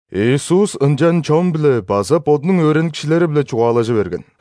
Иисус ынчан чон-биле база Бодунуң өөреникчилери-биле чугаалажы берген.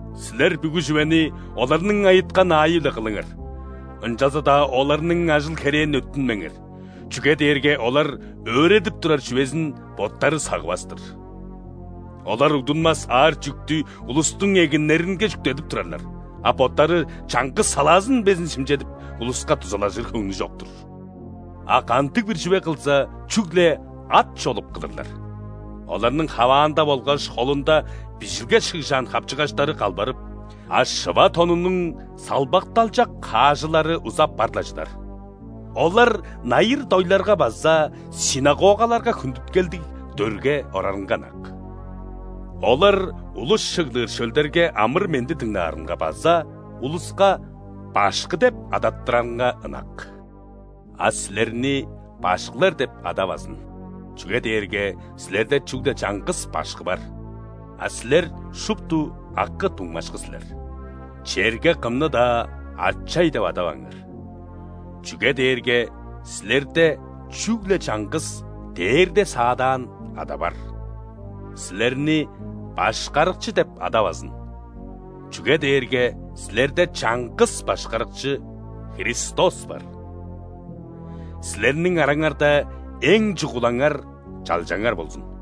Силер бүгү чүвени оларның айыткан аайы-биле кылыңар, ынчалза-даа оларның ажыл-херээн өттүнмеңер, чүге дээрге олар өөредип турар чүвезин боттары сагывас-тыр. Олар угдунмас аар чүъктү улустуң эгиннеринге чүктедип турарлар, а боттары чаңгыс салаазын безин шимчедип, улуска дузалажыр хөңнү чок-тур. А кандыг-бир чүве кылза, чүгле ат чолуп кылырлар, оларның хаваанда болгаш холунда Бижилге шыгжаан хапчыгаштары калбарып, а шыва тонунуң салбакталчак хаажылары узап бар-ла чыдар. Олар найыр-дойларга база ·синагогаларга хүндүткелдиг дөрге орарынга ынак. Олар улус чыглыр шөлдерге амыр-менди дыңнаарынга база улуска: „Башкы!“ – деп адаттырарынга ынак. А силерни „башкылар“ деп адавазын, чүге дээрге силерде чүгле чаңгыс Башкы бар, а силер шупту акы-дуңмашкы силер. Черге кымны-даа „ачай“ деп адаваңар, чүге дээрге силерде чүгле чаңгыс Дээрде саадаан Ада бар. Силерни „башкарыкчы“ деп адавазын, чүге дээрге силерде чаңгыс Башкарыкчы – Христос бар. Силерниң араңарда эң чугулаңар чалчаңар болзун.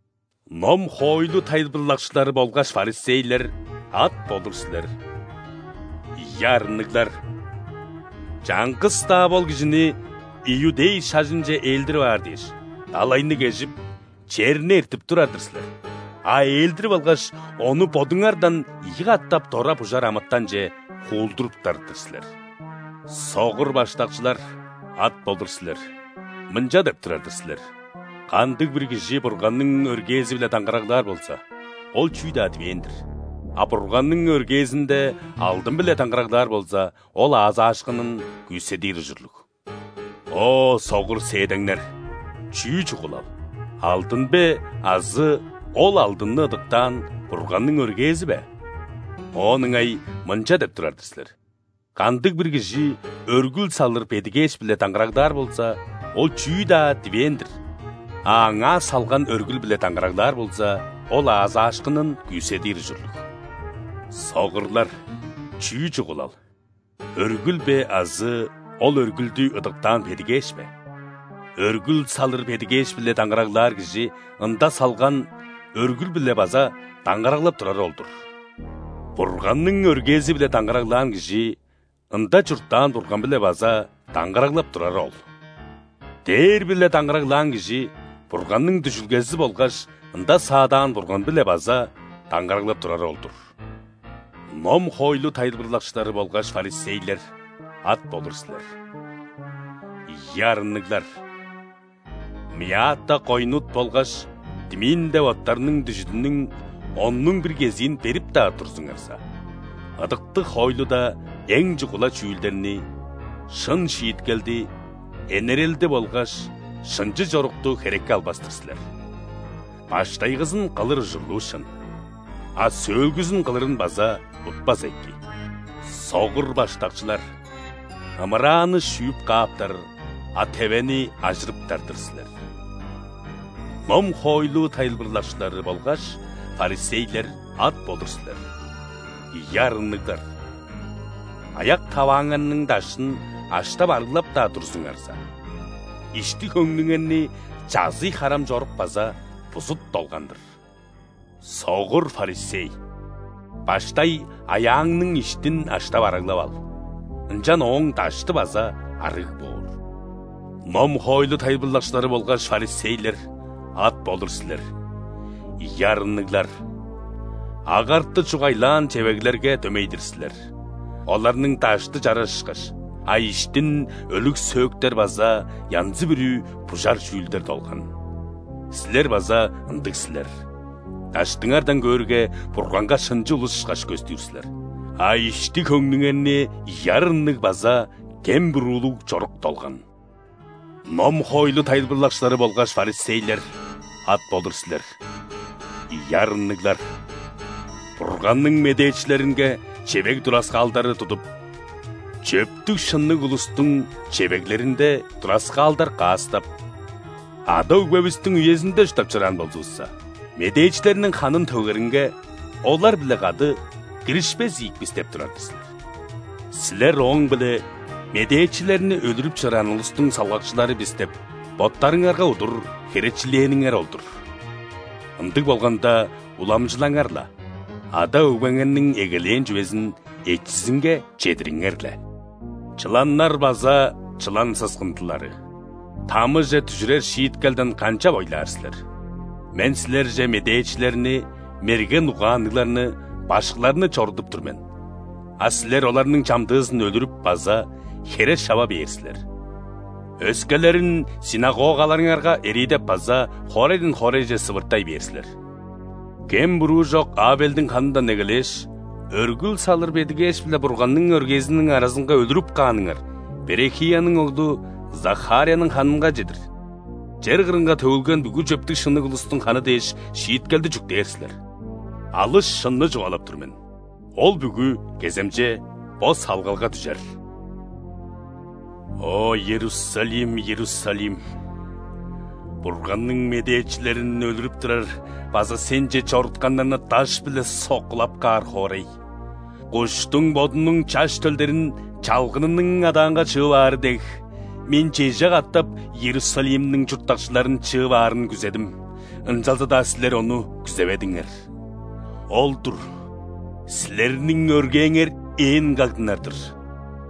Ном-хоойлу тайылбырлакчылары болгаш фарисейлер, ат болур силер! Ийи арынныглар! Чаңгыс-даа бол кижини иудей шажынче ээлдирип аар дээш, далайны кежип, черни эртип турар-дыр силер, а ээлдирип алгаш, ону бодуңардан ийи катап дора бужар амытанче хуулдуруптар-дыр силер. Согур баштакчылар, ат болур силер! Мынча деп турар-дыр силер: „Кандыг-бир кижи Бурганның өргээзи-биле даңгыраглаар болза, ол чүү-даа дивээн-дир, а Бурганның өргээзинде алдын-биле даңгыраглаар болза, ол аазаашкынын күүседир ужурлуг“. О, согур сээдеңнер! Чүү чугулал: алдын бе азы ол алдынны ыдыктаан Бурганның өргээзи бе?! Оон ыңай мынча деп турар-дыр силер: „Кандыг-бир кижи өргүл салыр бедигээш-биле даңгыраглаар болза, ол чүү-даа дивээн-дир, а аңаа салган өргүл-биле даңгыраглаар болза, ол аазаашкынын күүседир ужурлуг“. Согурлар! Чүү чугулал: өргүл бе азы ол өргүлдү ыдыктаан бедигээш бе?! Өргүл салыр бедигээш-биле даңгыраглаар кижи ында салган өргүл-биле база даңгыраглап турары ол-дур. Бурганның өргээзи-биле даңгыраглаан кижи ында чурттаан Бурган-биле база даңгыраглап турары ол. Дээр-биле даңгыраглаан кижи Бурганның дүжүлгези болгаш ында саадаан Бурган-биле база даңгыраглап турары ол-дур. Ном-хоойлу тайылбырлакчылары болгаш фарисейлер, ат болур силер! Ийи арынныглар! Мята, койнут болгаш тмин деп оъттарның дүжүдүнүң оннуң бир кезиин берип-даа турзуңарза, ыдыктыг хоойлуда эң чугула чүүлдерни: шын шииткелди, энерелди болгаш шынчы чорукту херекке албас-тыр силер. Баштайгызын кылыр ужурлуу шын, а сөөлгүзүн кылырын база утпаза эки. Согур баштакчылар! Ымырааны шүүп кааптар, а тевени ажырыптар-дыр силер! Ном-хоойлу тайылбырлакчылары болгаш фарисейлер, ат болур силер! Ийи арынныглар! Аяк-тавааңарның даштын аштап-арыглап-даа турзуңарза, ишти-хөңнүңерни чазый-харам чорук база бузут долган-дыр. Согур фарисей! Баштай аяаңның иштин аштап-арыглап ал, ынчан ооң дашты база ·арыг боор. Ном-хоойлу тайылбырлакчылары болгаш фарисейлер, ат болур силер! Ийи арынныглар! Агарты чугайлаан чевеглерге дөмей-дир силер: оларның дашты чараш ышкаш, а иштин өлүг сөөктер база янзы-бүрү бужар чүүлдер долган! Силер база ындыг силер: даштыңардан көөрге, Бурганга шынчы улус ышкаш көстүр силер, а ишти-хөңнүңерни ийи арынныг база кем-буруулуг чорук долган. Ном-хоойлу тайылбырлакчылары болгаш фарисейлер, ат болур силер! Ийи арынныглар! Бурганның медээчилеринге чевег тураскаалдары тудуп, чөптүг-шынныг улустуң чевеглеринде тураскаалдар каастап: „Ада-өгбевистиң үезинде чурттап чораан болзувусса, медээчилерниң ханын төгеринге олар-биле кады киришпес ийик бис“ – деп турар-дыр силер. Силер ооң-биле, „Медээчилерни өлүрүп чораан улустуң салгакчылары бис“ деп, боттарыңарга удур херечилээниңер ол-дур. Ындыг болганда, уламчылаңар-ла, ада-өгбеңерниң эгелээн чүвезин эчизинге чедириңер-ле! Чыланнар база чылан сыскындылары! Тамыже дүжүрер шииткелден канчап ойлаар силер! Мен силерже медээчилерни, мерген угаанныгларны, башкыларны чорудуп тур мен, а силер оларның чамдыызын өлүрүп база хере шава бээр силер, өскелерин ·синагогаларыңарга эриидеп база хоорайдан хоорайже сывыртай бээр силер. Кем-буруу чок Авелдиң ханындан эгелээш, өргүл салыр бедигээш биле Бурганның өргээзиниң аразынга өлүрүп кааныңар Берехияның оглу Захарияның ханынга чедир, чер кырынга төгүлген бүгү чөптүг-шынныг улустуң ханы дээш, шииткелди чүктээр силер. Алыс шынны чугаалап тур мен: ол бүгү кеземче бо салгалга дүжер!» «О, Иерусалим, Иерусалим! Бурганның медээчилерин өлүрүп турар база сенче чорутканнарны даш-биле соккулап каар хоорай! Куштуң бодунуң чаш төлдерин чалгынының адаанга чыып аары дег, Мен чеже катап Иерусалимниң чурттакчыларын чыып аарын күзедим, ынчалза-даа силер ону күзеведиңер! Ол-дур, силерниң өргээңер ээн кагдынар-дыр.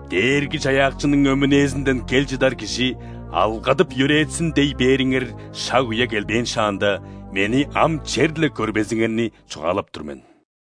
„Дээрги-Чаяакчының өмүнээзинден кел чыдар Кижи алгадып-йөрээтсин!“ – дей бээриңер шаг-үе келбээн шаанда, Мени ам черле көрбезиңерни чугаалап тур мен».